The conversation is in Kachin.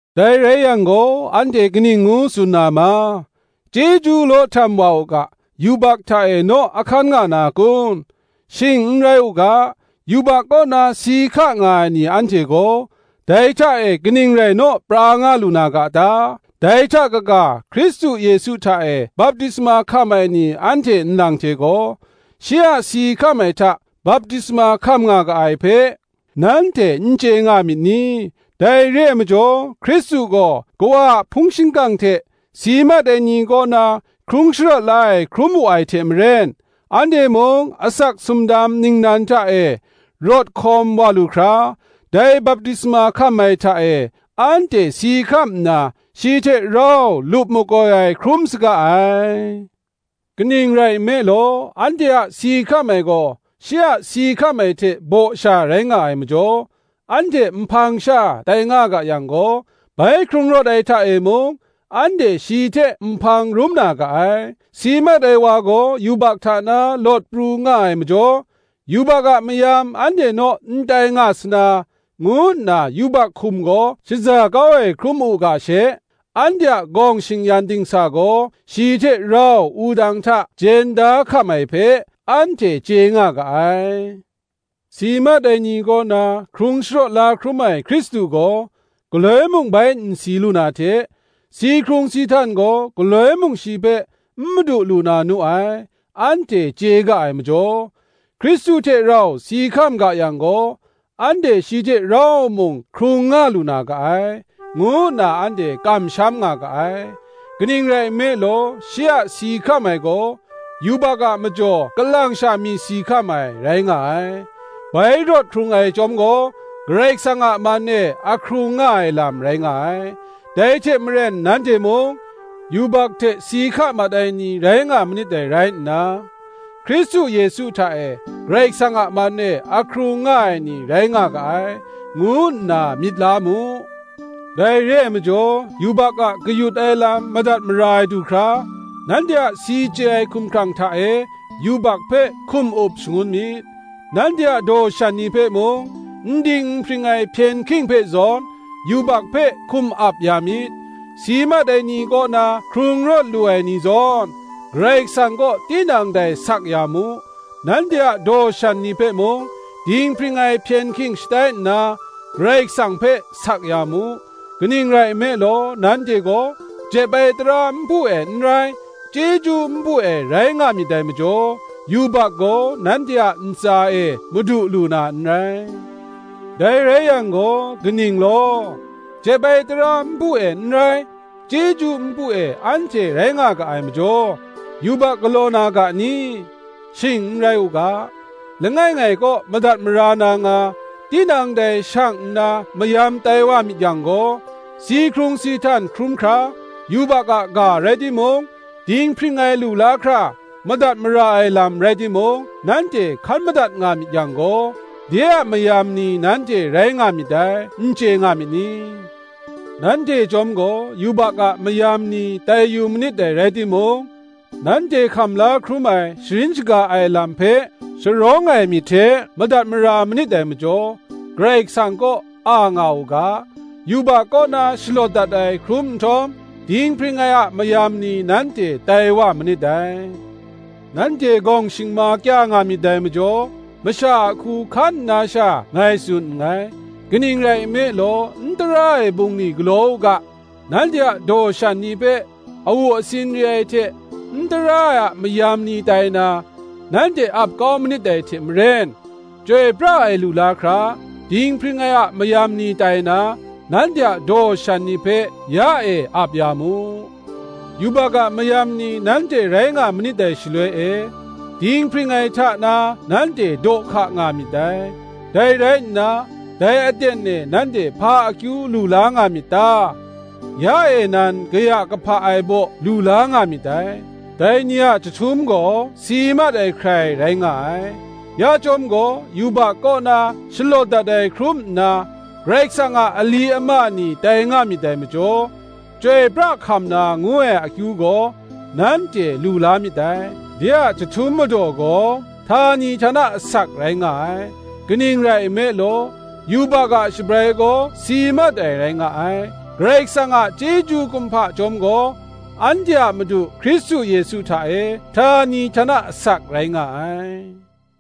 Dai rai yang gaw anhte kaning ngu tsun na ma? Chyeju law htam wa u ga, yubak hta e naw a hkan nga na kun? Shing n rai u ga. Yubak kaw na si hka nga ai ni anhte gaw, dai hta e kaning rai naw pra nga lu na ga ta? Dai hta kaga, Hkristu Yesu hta e baptisma hkam ai ni anhte nlang hte gaw, shi a si hkam ai hta baptisma hkam nga ga ai hpe, nanhte n chye nga myit ni? Dai re ai majaw, Hkristu gaw Kawa a hpung shingkang hte si mat ai ni kaw na hkrung sharawt la ai hkrum wu ai hte maren, anhte mung asak sumdam ningnan hta e rawt hkawm wa lu hkra, dai baptisma hkam ai hta e, anhte si hkam nna shi hte rau lup makoi ai hkrum saga ai. Kaning rai nme law, anhte a si hkam ai gaw shi a si hkam ai hte baw sha rai nga ai majaw, anhte nhpang sha tai nga ga yang gaw, bai hkrung rawt ai hta e mung, anhte shi hte nhpang rum na ga ai. Si mat ai wa gaw yubak hta na lawt pru nga ai majaw, yubak a mayam anhte naw n tai nga sa na, ngu nna yubak hkum gaw shaza kau ai hkrum u ga she, anhte a gawng shing-yan dingsa gaw shi hte rau wudang hta jen da hkam ai hpe, anhte chye nga ga ai. Si mat ai ni kaw na hkrung sharawt la hkrum ai Hkristu gaw, galoi mung bai n si lu na hte, si hkrung si htan gaw galoi mung shi hpe n madu lu na nu ai, anhte chye ga ai majaw, Hkristu hte rau si hkam ga yang gaw, anhte shi hte rau mung hkrung nga lu na ga ai, ngu nna anhte kamsham nga ga ai. Kaning rai nme law, shi a si hkam ai gaw, yubak a majaw kalang sha mi si hkam ai, rai nga ai; bai rawt hkrung ai chyawm gaw, Karai Kasang a man e ahkrung nga ai lam rai nga ai. Dai hte maren nanhte mung, yubak hte si hka mat ai ni rai nga manit dai rai nna, Hkristu Yesu hta e Karai Kasang a man e ahkrung nga ai ni rai nga ga ai, ngu nna myit la mu. Dai re ai majaw, yubak a kayut ai lam madat mara ai du hkra, nanhte a si chye ai hkumhkrang hta e yubak hpe hkum up shangun myit; nanhte a daw shan ni hpe mung, n ding n hpring ai hpyen hking hpe zawn, yubak hpe hkum ap ya myit; si mat ai ni kaw na hkrung rawt lu ai ni zawn, Karai Kasang kaw tinang dai sak ya mu; nanhte a daw shan ni hpe mung, dinghpring ai hpyen hking shatai nna, Karai Kasang hpe sak ya mu. Kaning rai nme law, nanhte gaw jep ai tara npu e n rai, chyeju npu e rai nga myit dai majaw, yubak gaw nanhte a ntsa e madu lu na n rai. Dai rai yang gaw, kaning law? jep ai tara npu e n rai, chyeju npu e anhte rai nga ga ai majaw, yubak galaw na ga ni? Shing n rai u ga. Langai ngai kaw madat mara na nga, tinang dai shang nna mayam tai wa myit yang gaw, si hkrung si htan hkrum hkra yubak a ga rai timung, dinghpring ai lu la hkra madat mara ai lam rai timung, nanhte hkan madat nga myit yang gaw, de a mayam ni nanhte rai nga myit dai, n chye nga myit ni? Nanhte chyawm gaw yubak a mayam ni tai yu manit dai rai timung, nanhte hkam la hkrum ai sharin shaga ai lam hpe, sharawng ai myit hte madat mara manit dai majaw, Karai Kasang kaw a nga u ga: yubak kaw na shalawt dat ai hkrum nhtawm, dinghpring ai a mayam ni nanhte tai wa manit dai. Nanhte gawng shingma kya nga myit dai majaw, masha a hku hkan nna sha ngai tsun nngai: kaning rai nme law, n tara ai bungli galaw u ga, nanhte a daw shan ni hpe awu asin re ai hte n tara ai a mayam ni tai na, nanhte ap kau manit dai hte maren, chyoi pra ai lu la hkra, dinghpring ai a mayam ni tai na, nanhte a daw shan ni hpe ya e ap ya mu. Yubak a mayam ni nanhte rai nga manit dai shaloi e, dinghpring ai hta na nanhte daw hka nga myit dai. Dai rai nna, dai aten e nanhte hpa akyu lu la nga myit ta? ya e nan kaya kahpa ai baw lu la nga myit dai: dai ni a chyahtum gaw si mat ai hkrai rai nga ai. Ya chyawm gaw yubak kaw na shalawt dat ai hkrum nna, Karai Kasang a ali ama ni tai nga myit dai majaw, chyoi pra hkam na ngu ai akyu gaw, nanhte lu la myit dai: de a chyahtum madaw gaw htani htana asak rai nga ai. Kaning rai nme law, yubak a shabrai gaw si mat ai rai nga ai; Karai Kasang a chyeju kumhpa chyawm gaw, anhte a Madu Hkristu Yesu hta e, htani htana asak rai nga ai.